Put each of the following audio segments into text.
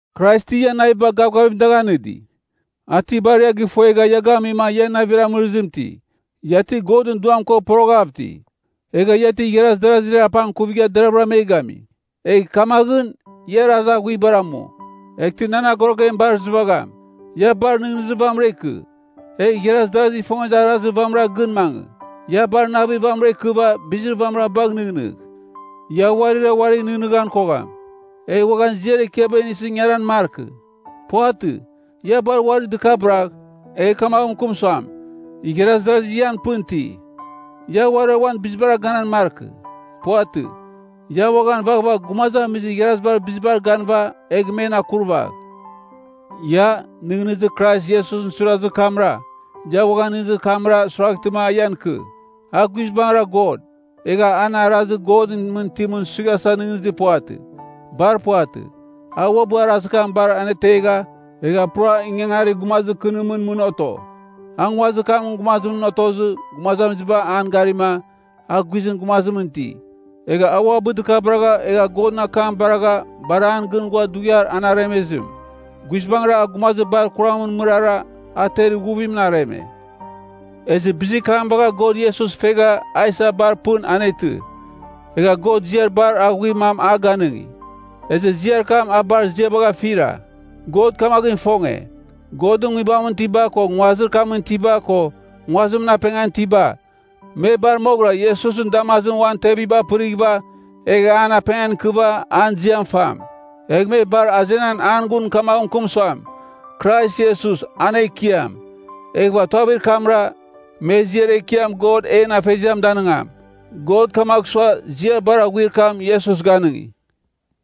Krais ti ian naviba gavgavim dagh anɨdi? A ti bar ia gɨfuegha ia gamima ia navir amɨrɨzimɨn iti? Ia ti Godɨn Duam ko poroghav iti? Egha ia ti igharazi darazir apangkuvigha deravɨra me gami? Egh kamaghɨn, ia arazir aghuibar amu, eghtɨ nan agorogem bar izɨvagham. Ia bar nɨghnɨzir vamɨra ikɨ, egh igharaz darazigh ifongezir arazir vamɨran gɨn mangɨ. Ia bar navir vamɨra ikɨva bizir vamɨra bagh nɨghnɨgh. Ia uarira uarigh nɨghnɨghan kogham, egh uaghan ziar ekiaba inisɨ ingaran markɨ. Puvatɨ. Ia bar uari dɨkabɨragh, egh kamagh mɨkɨm suam, igharaz darazi ian pɨn iti. Ia uarira uan bizibara ganan markɨ. Puvatɨ. Ia uaghan vaghvagh gumazamizir igharazibar bizibar ganɨva egh men akurvagh. Ia, nɨghnɨzir Krais Iesus suirazir kamra, ia uaghan nɨghnɨzir kamra suiraghtɨma a ian ikɨ. A guizbangɨra God, egha an arazir Godɨn mɨn itimɨn suighasa nɨghnɨzir puvatɨ. Bar puvatɨ. A uabɨ arazir kam bar anetegha, egha pura ingangarir gumazir kɨnimɨn mɨn oto. A nguazir kamɨn gumazimɨn otozɨ gumazamiziba an garima, a guizɨn gumazimɨn iti. Egha a uabɨ dɨkabɨragha egha Godɨn akam baragha bar an gɨn ghua dughiar an aremezim. Guizbangɨra a gumazir bar kuramɨn mɨrara, a ter ighuvimɨn areme. Ezɨ bizir kam bagha God Iesus fegha a isa bar pɨn anetɨ. Egha God ziar bar aghuir mam a ganɨngi, ezɨ ziar kam a bar ziabagh afira. God kamaghɨn ifonge, Godɨn nguibamɨn itiba ko nguazir kamɨn itiba ko nguazimɨn apengan itiba, me bar moghɨra Iesusɨn damazimɨn uan tevibar pɨrighɨva egh an apengan ikɨva an ziam fam. Egh me bar azenan an gun kamaghɨn mɨkɨm suam, “Krais Iesus, an Ekiam!” Eghɨva tuavir kamra, me ziar ekiam God en Afeziam danɨngam. God kamagh sua, ziar bar aghuir kam Iesus ganɨngi.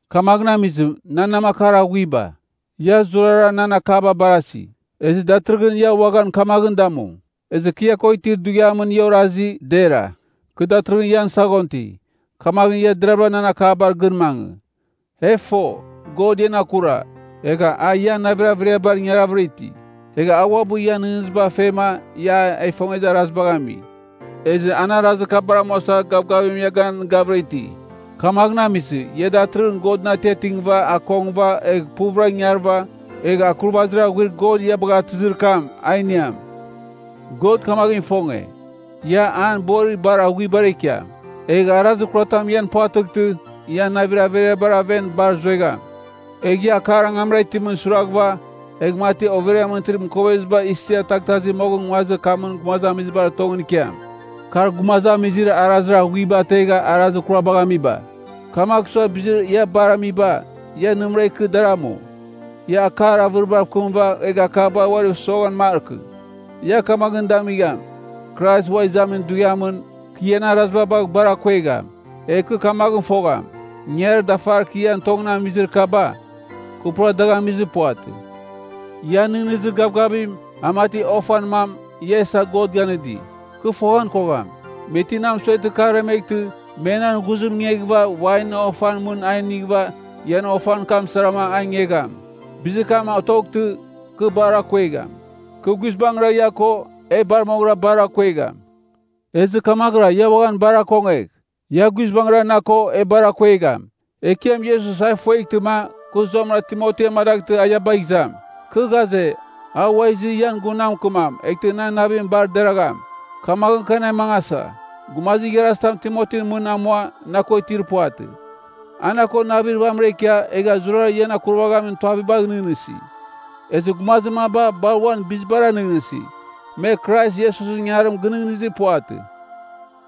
Kamaghɨn amizɨ, nan namakar aghuiba, ia zurara nan akaba barasi, ezɨ datɨrɨghɨn ia uaghan kamaghɨn damu. Ezɨ kɨ ia ko itir dughiamɨn ia orasi, dera. Kɨ datɨrɨghɨn ian saghon ti, kamaghɨn ia deravɨra nan akabar gɨn mangɨ. E fo, God ian akura, egha a ian navir averiabar ingaravɨra iti. Egha a uabɨ ian nɨghnɨziba fema ia a ifongezir arazibagh ami, ezɨ an arazir kabar amuasa gavgavim ia ganɨgavɨra iti. Kamaghɨn amizɨ, ia datɨrɨghɨn Godɨn atiatingɨva akongɨva egh puvɨra ingarɨva, egh akurvazir aghuir God ia bagha atɨzir kam, a iniam. God kamaghɨn ifonge, ia an borir bar aghuibara ikiam, egh arazir kuratam ian puvatɨghtɨ, ia navir averiabar aven bar zuegham. Egh ia akar angamra itimɨn suiraghɨva, egh mati overiamɨn itir mɨkoveziba isia taghtasi moghɨn nguazir kamɨn gumazamizibar tongɨn ikiam. Kar gumazamizir arazir aghuiba ategha arazir kurabagh amiba. Kamagh sua bizir ia bar amiba, ia nɨmɨra ikɨ dar amu. Ia akar avɨribav kɨmɨva egh akabar uariv soghan markɨ. Ia kamaghɨn damigham, Krais Ua Izamin Dughiamɨn, kɨ ian araziba bagh bar akuegham. Egh kɨ kamaghɨn fogham, ingangarir dafar kɨ ian tongɨn amizir kaba, kɨ pura dagh amizir puvatɨ. Ian nɨghnɨzir gavgavim, a mati ofan mam ia isa God ganɨdi. Kɨ foghan kogham, me ti na mɨsueghtɨ kɨ aremeghtɨ me nan ghuzim ingeghɨva wainɨn ofan mɨn a inighɨva ian ofan kam sarama a ingegham. Bizir kam otoghtɨ, kɨ bar akuegham. Kɨ guizbangɨra ia ko, e bar moghɨra bar akuegham. Ezɨ kamaghɨra ia uaghan bar akongegh. Ia guizbangɨra na ko, e bar akuegham. Ekiam Iesus a ifueghtɨma, kɨ zuamɨra Timoti amadaghtɨ a ia bagh izam. Kɨ ghaze, a ua izɨ ian gun na mɨkɨmam, eghtɨ nan navim bar deragham. Kamaghɨn, kɨ anemangasa. Gumazir igharazitam Timotin mɨn amua na ko itir puvatɨ. A na ko navir vamɨra ikia egha zurara ian akurvaghamin tuavibagh nɨghnɨsi. Ezɨ gumazir maba bar uan bizibara nɨghnɨsi, me Krais Iesusɨn ingangarim gɨnɨghnɨzir puvatɨ.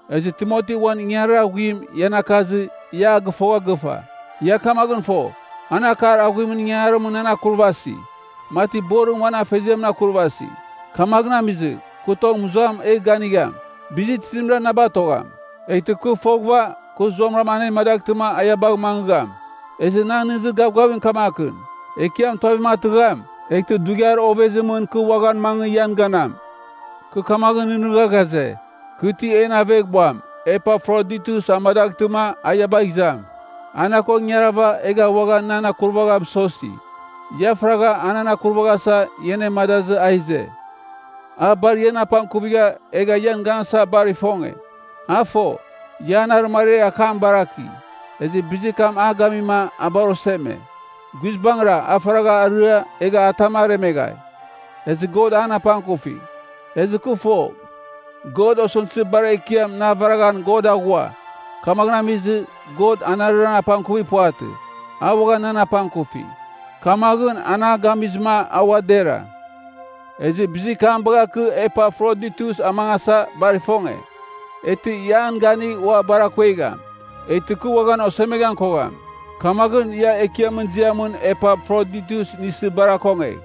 Ezɨ Timoti uan ingangarir aghuim ian akazɨ, ia a gɨfogha gɨfa. Ia kamaghɨn fo, an akar aghuimɨn ingangarimɨn nan akurvasi, mati borim uan afeziamɨn akurvasi. Kamaghɨn amizɨ, kɨ tong mɨzuam egh ganigham, bizir tizimra na batogham. Eghtɨ kɨ foghɨva kɨ zuamɨra anemadaghtɨma a ia bagh mangɨgham. Ezɨ nan nɨghnɨzir gavgavim kamakɨn, Ekiam tuavim atɨgham, eghtɨ dughiar ovezimɨn kɨ uaghan mangɨ ian ganam. Kɨ kamaghɨn nɨghnɨgha ghaze, kɨ ti en aveghbuam Epafroditus amadaghtɨma a ia bagh izam. A na ko ingarava, egha uaghan nan akurvagha mɨsosi. Ia faragha, a nan akurvaghasa, ia anemadazɨ a ize. A bar ian apangkuvigha egha ian ganasa bar ifonge. A fo, ia an arɨmariar akam baraki, ezɨ bizir kam a gamima a bar oseme. Guizbangɨra, a faragha arɨa, egha atam aremeghai. Ezɨ God an apangkufi. Ezɨ kɨ fo, God osɨmtɨzir bar ekiam na avaraghan God aghua. Kamaghɨn amizɨ, God anarɨra apangkuvir puvatɨ, a uaghan nan apangkufi. Kamaghɨn an a gamizɨma a ua dera. Ezɨ bizir kam bagha kɨ Epafroditus amangasa bar ifonge, eghtɨ ia an ganigh ua bar akuegham. Eghtɨ kɨ uaghan osemeghan kogham. Kamaghɨn, ia Ekiamɨn ziamɨn Epafroditus inisɨ bar akongegh.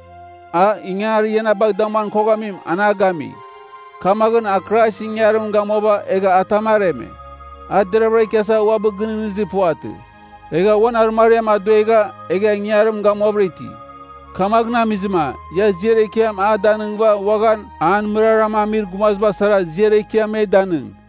A, ingangarir ia na bagh damuan koghamim, an a gami. Kamaghɨn, a Kraisɨn ingangarim gamuava egha atam areme. A deravɨra ikiasa uabɨ gɨnɨghnɨzir puvatɨ. Egha uan arɨmariam aduegha egha ingangarim gamuavɨra iti. Kamaghɨn amizɨma, ia ziar ekiam a danɨngɨva uaghan an mɨraram amir gumaziba sara ziar ekiam me danɨng.